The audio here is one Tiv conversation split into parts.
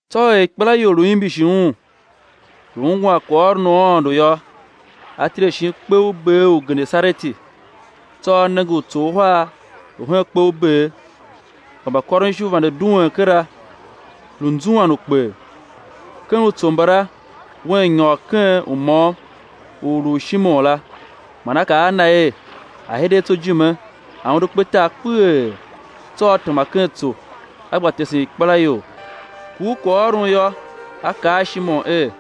Tsô er ikpelaior lu imbishi Un, lu ungwan kwaghôron u Aôndo yô, a tile shin kpe u ber u Genesareti. Tsô A nenge utso uhar lu hen kpe u ber, kpa mbakôronishu vande duen kera, lu nzuan ukper. Ken utso mbala Un nyôr ken u môm u lu u Shimon la, man A kaa a na er a̱ hide a tsô ijime a̱ undu kpetar kpeghee; tsô A tema ken tso, A gba tesen ikpelaior. Kur kwaghôron yô, A kaa a Shimon er: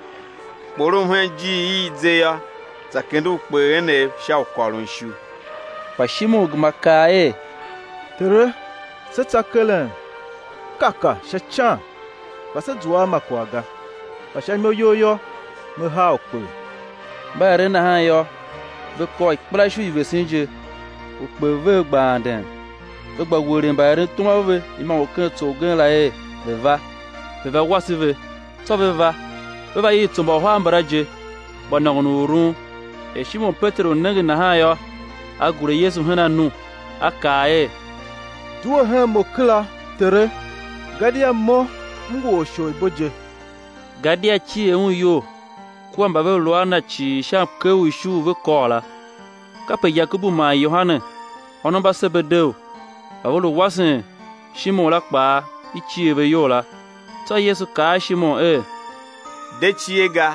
Kporom hen ijiir i i ze yô, za haa ukper enev sha u kôron ishu. Kpa Shimon gema kaa er: Tere, se tsa keren kaka sha ican, kpa se zua a ma kwagh ga; kpa sha imo You yô, me haa ukper. Mba eren nahan yô, ve kôr ikpelaishu i vesen je, ukper vev gba anden. Ve gba welegh mbaerentom a ve imôngo ken tso ugen la er ve̱ va, ve̱ va wase ve. Tsô ve va, ve va iv utso mba uhar mbala je, gba nôngon u urun. Er Shimon Peteru nenge nahan yô, a gure Yesu hen anu, a kaa er: Due hen mo kera, Tere, gadia mo m ngu or u isholibo je. Gadia cier un iyol kua mba ve lu a na cii sha mker u ishu u ve kôr la. Kape Yakobu man Yohane, ônov mba Sebedeu, mba ve lu mbawasen Shimon la kpaa i cier ve iyol la. Tsô Yesu kaa a Shimon er: De cie ga,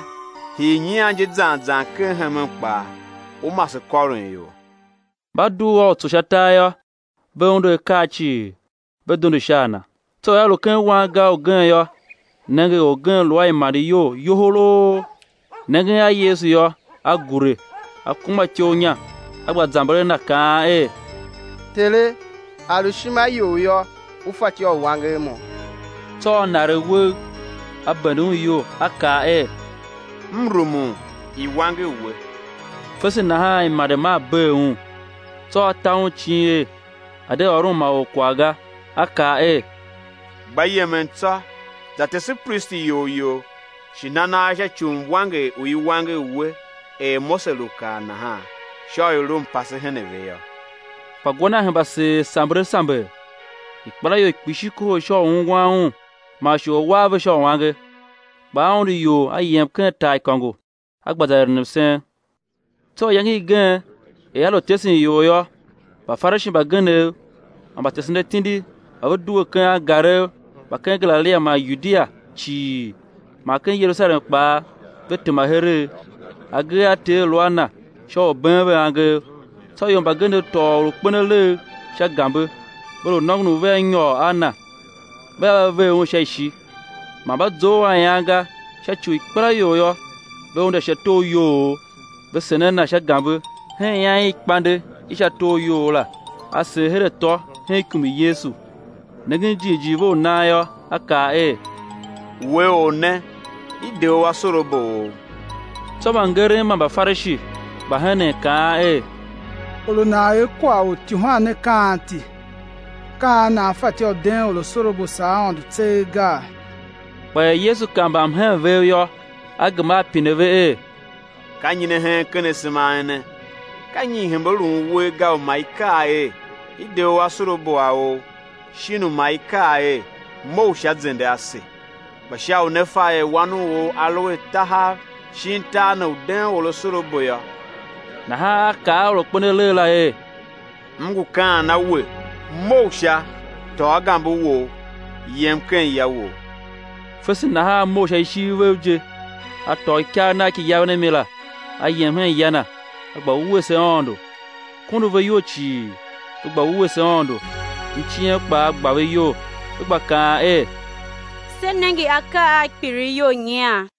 hii nyian je zan zan ken hemen kpaa ú mase kôron ior. Mba dugh a utso sha tar yô, ve undu akaa cii, ve dondo sha a Na. Tsô er A lu ken wangar ugen yô, nenge, orgen lu a imande iyol yoholoo; nengen a Yesu yô, a gure, a kuma ityough inya, a gba zamber a Na, kaan er: Tere, a lu ishima You yô, U fatyô u wanger mo. Tsô A naregh uwegh, A bende un iyol, A kaa er: M rumun, i̱ wanger we! Fese nahan imande maa bee un. Tsô A ta un icin er a̱ de ôron ma or kwagh ga; A kaa er: Gba yemen tsô, za tese pristi iyol you, shi na nagh sha ci u mwanger u i wanger we er Mose lu kaa nahan, sha u i̱ lu mpase hen a ve yô. Kpa gwa Na hemba seer samber a samber; ikpelaior kpishi kohol sha u ungwan Un man shi u A̱ war ve sha uange. Kpa A undu ior A yem ken taaikôngo, A gba za eren msen. Tsô iyange igen er A lu tesen ior yô, Mbafarishi mbagenev man mbatesen atindi mba ve due ken angarev mba ken Galilia man Yudia cii man ken Yerusalem kpaa, ve tema heregh; agee a Ter lu a Na sha u been ve angev. Tsô ior mbagenev tôô or u kpen alegh sha gambe, ve lu nôngon u vea nyôr a na, vea va ver Un sha ishi. Man mba zough a ian ga, sha ci u ikpelaior yô, ve unde sha tor iyoughough, ve sen a na sha gambe hen ian i ikpande i sha tor u iyou la, a sen her atô hen ikum i Yesu. Nengen jighjigh ve u nan yô, A kaa er: We or ne, i de u asorabo ou. Tsô mbangeren man Mbafarishi gba henen, kaan er: Or u nan er kwagh u ityuhwan ne ka anti? Ka an nana fatyô u den or asorabo, saa Aôndo tseegh gaa? Kpa er Yesu kav mbamhen vev yô, A gema A pine ve er: Ka nyi ne hen ken asema a ene? Ka nyi i hembe lun uwer ga, u ma i kaa er: I de u asorabo a ou, shin u ma i kaa er: Mough sha, zende ase? Kpa sha u né fa er Wan u or A lu a tahav shin tar ne u den or asorabo yô, nahan A kaa a or u kpen alegh la er: M ngu kaan a we: Mough sha, tôô gambe wou, yem ken ya wou. Fese nahan a mough sha ishiv vev je, a tôô ikagh nagh ki yaven a mi la, a yem hen ya na, a gba wuese Aôndo. Kondo ve iyol cii, ve gba wuese Aôndo; mciem kpaa gba ve iyol, ve gba kaan er: Se nenge akaa a kpilighyol nyian.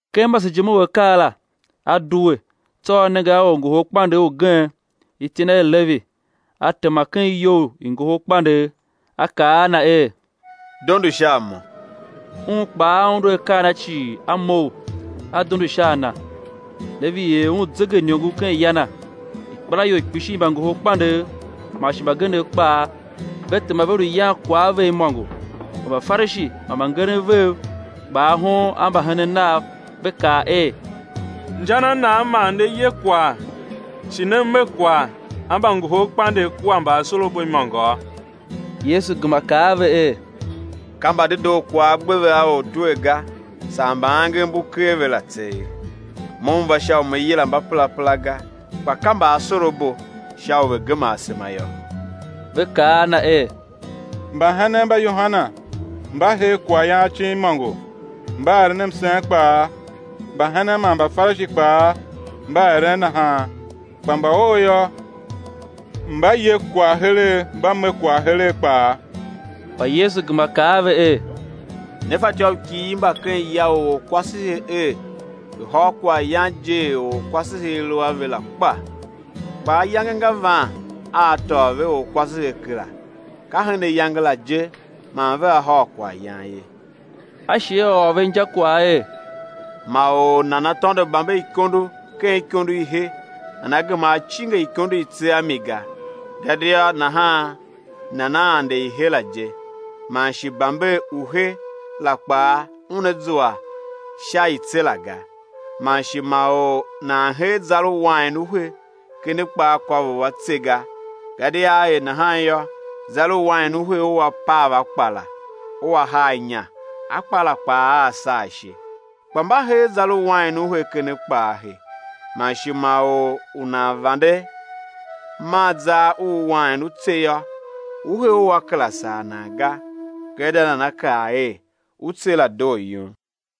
Ken masejime u akaa la, A due, tsô A nenge a orngoholkpandegh ugen, iti na er Levi, a tema ken iyou i ngohol kpandegh A kaa a na er: Dondo sha a Mo. Un kpaa a undu akaa cii, a mough, a dondo sha a Na. Levi er Un zegeiniongo ken ya na; ikpelaior kpishi i mbangoholkpandegh man shi mbagenev kpaa ve tema ve lu yan kwagh a ve imôngo. Kpa Mbafarishi man mbangeren vev gba ahon a mbahenen Nav, ve kaa er: Inja na nan ne ye kwagh shi ne me kwagh a mbangoholkpandegh kua mbaasorabo imôngo? Yesu gema kaa a ve er: Ka mbadedoo kwagh a gbe ve a ortwer ga, saa mba angev mbu ker ve la tseegh. Mo M va sha u Me yila mbaperapera ga, kpa ka mbaasorabo, sha u ve̱ gema asema yô. Ve kaa a Na er: Mbahenen mba Yohane mba her kwaghyan acin imôngo, mba eren msen kpaa; mbahenen mba Mbafarishi kpaa mba eren nahan, kpa mba Ou yô, mba ye kwagh heregh, mba me kwagh heregh kpaa. Kpa Yesu gema kaa a ve er: Ne fatyô u kighir mba ken ya u orkwasehe er ve̱ hôr kwaghyan je er orkwasehe a lu a ve la kpa? Kpa ayange nga van a á tôô ve orkwasehe kera, ka hen ayange la je man vea hôr kwaghyan ye. A shi A ôr ve injakwagh er: Ma or nana tôndo bamberikondo ken ikondo i he nana gema a cinge ikondo i tse a mi ga; gadia nahan nana ande i he la je, man shi bamber u he la kpaa una zua sha i tse la ga. Man shi ma or nan hee zar u wain u he ken akpaakôvough a tse ga; gadia á er nahan yô, zar u wain u he ua pav akpa la, ua haa inya akpa la kpaa aa saa ishe. Kpa mba hee zar u wain u he ken akpa a he. Man shi ma or u nan vande man zar u wain u tse yô, u he ua kera sar nan ga; gadia nana kaa er: U tse la doo yum.